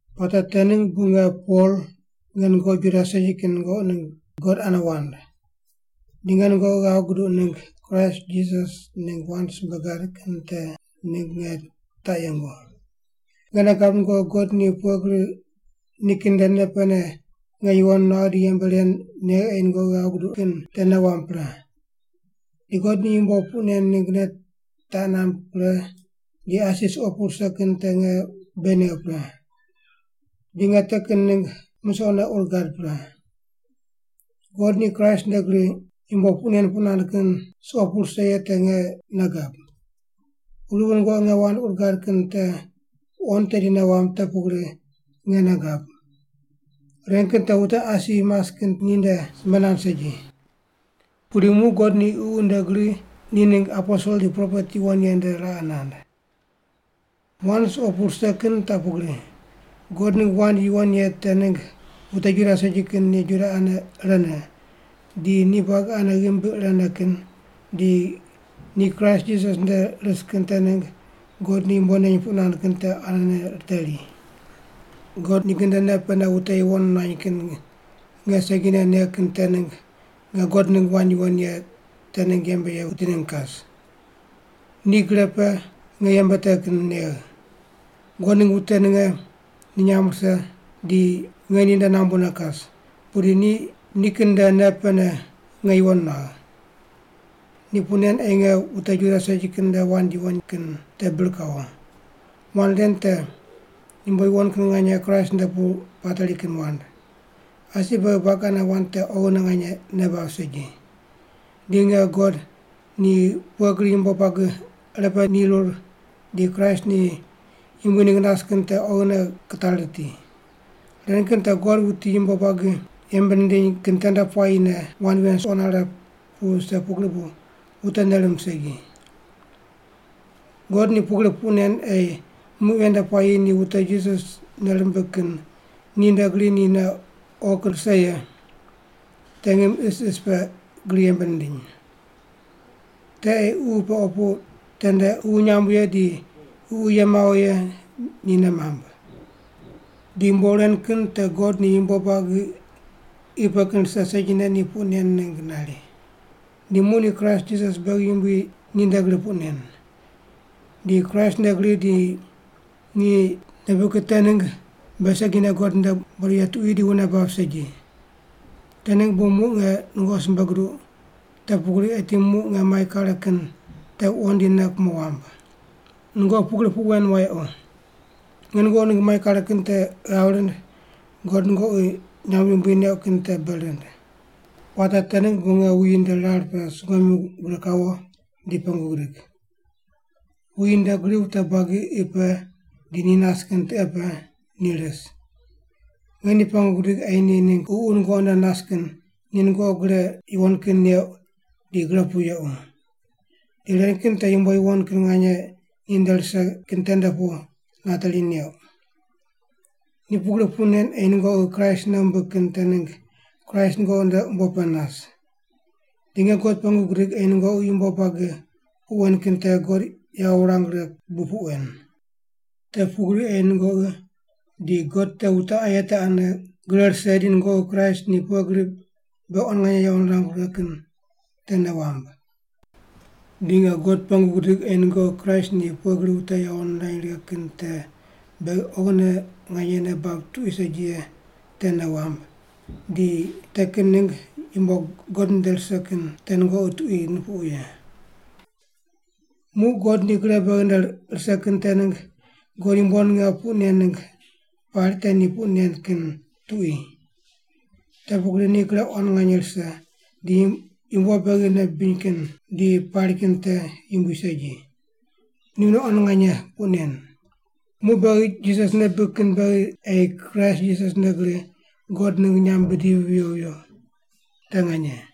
Puate te ningg bu nge Pol, nge nungoqi Juda segi kin nungoqi ningg God ane wand. Di nge nungoqi ghav guduq ningg Kraist Jisas ningg wand simbe gad kin te ningg nge taq yengu. Nge nei gab nungoqi God ni pughe gri nikin nde nei pene nge yuwon nuagh di yembe ren negh ei nungoqi ghav guduq kin te nei wamb pre. Di God ni yumbo puq nen ningg nei taq namb pre di asi suqo pu rise kin te nge bei negh pre. Di nge te kin ningg misoqne ur gad pre. God ni Kraist nde gri yumbo puq nen puq nand kin suqo pu rise ye te nge nei gab. Pugri bu nungoqi nge wand ur gad kin te wuqond tedi nei wamb te pugri nge nei gab. Ren kin te wute asi mas kin ninde simbe nand segi. Pudi muq God ni Ququ nde gri ni ningg aposel di propet yuwon ye nde raqe nand. Wand suqo pu rise kin taq pugri: God ningg wand yuwon ye te ningg wute Juda segi kin ni Juda ane irene, di ni buagi ane ghimbi irene kin, di ni Kraist Jisas nde ris kin te ningg God ni yumbo neny puq nand kin te anene riteri. God nikin nde nei pene wute yuwon nuany kin nge segine negh kin te ningg nge God ningg wand yuwon ye te ningg yembe ye wuti ningg kas. Ni gre pe nge yembe te kin negh. God ningg wute ninge ni nyamb rise di nge ninde nambune kas, pudi ni nikin nde nei pene nge yuwon nuagh. Ni puq nen ei nge wute Juda segi kin nde wand yuwon kin te bir kawo. Wand ren te yumbo yuwon kin nganye Kraist nde pu pateri kin wand. Asi beghi buagi ane wand te oghine nganye nei bab segi. Di nge God ni pughe gri yumbo buagi irepe nirur di Kraist ni yumbui ningg nas kin te oghine kitari riti. Ren kin te God wuti yumbo buagi yembe nindiny kin tende puayine wand ven suqo nare pu vise pugri bu wute nei mamb segi. God ni pugri puq nen ei muq ven nde puayi ni wute Jisas nei rimbig kin ninde gri ni nei oghi kin rise ye te ngim isis pe gri yembe nindiny. Te ei ququ pe opu tende ququ nyamb ye di ququ ye mawo ye ni nei mamb. Di yumbo ren kin te God ni yumbo buagi qi pe kin rise segine ni puq nen ningg nari. Di muq ni Kraist Jisas beghi Yumbui ninde gri puq nen. Di Kraist nde gri di ni nei bibig kin te ningg beghi segine God nde bodo ye tuqui di wune bab segi. Te ningg bu muq nge nungoqi simbe guduq te pugri eti muq nge mai kare kin te wuqond di nei kumo wamb. Nungoqi pugri puq wen wayequ. Nge nungoqi ningg mai kare kin te ghav rind God nungoqi nyamb yumbui neuq kin te bei rind. Puate te ningg bu nge wuyi nde rar pe sungomyu gure kawo di pengu gidig. Wuyi nde gri wute buagi qi pe di ni nas kin tiqe pe ni ris. Nge ni pengu gidig ei ni ningg Ququ nungoqi nde nas kin ni nungoqi gre yuwon kin neuq di gre pu yequ. Di ren kin te yumbo yuwon kin nganye ninde rise kin tende pu nateri neuq. Ni pugri puq nen ei nungoqi Kraist nei wumbig kin te ningg Kraist nungoqi nde umbo pe nas. Di nge God pengu gidig ei nungoqi yumbo buagi puq wen kin te God yawo wurang righe bu puq wen. Te pugri ei nungoqi di God te wute aye te ane gre rise di nungoqi Kraist ni pughe gri beghi quan nganye yawo nirangu righe kin te nei wamb. Di nge God pengu gidig ei nungoqi Kraist ni pughe gri wute yawo nirany righe kin te beghi oghine nganye nei bab tuqui segi ye te nei wamb, di te kin ningg yumbo God nde rise kin te nungoqi tuqui nupuqu ye. Muq God ni gre beghi nde rise kin te ningg God yumbo ninge puq nen ningg pari te ni puq nen kin tuqui. Te pugri ni gre quan nganye rise di yumbo beghi nei bibiny kin di pari kin te yumbui segi. Ni mune quan nganye puq nen. Muq beghi Jisas nei bibig kin beghi ei Kraist Jisas nde gri God ningg nyamb bidivi viyo viyo. Te nganye.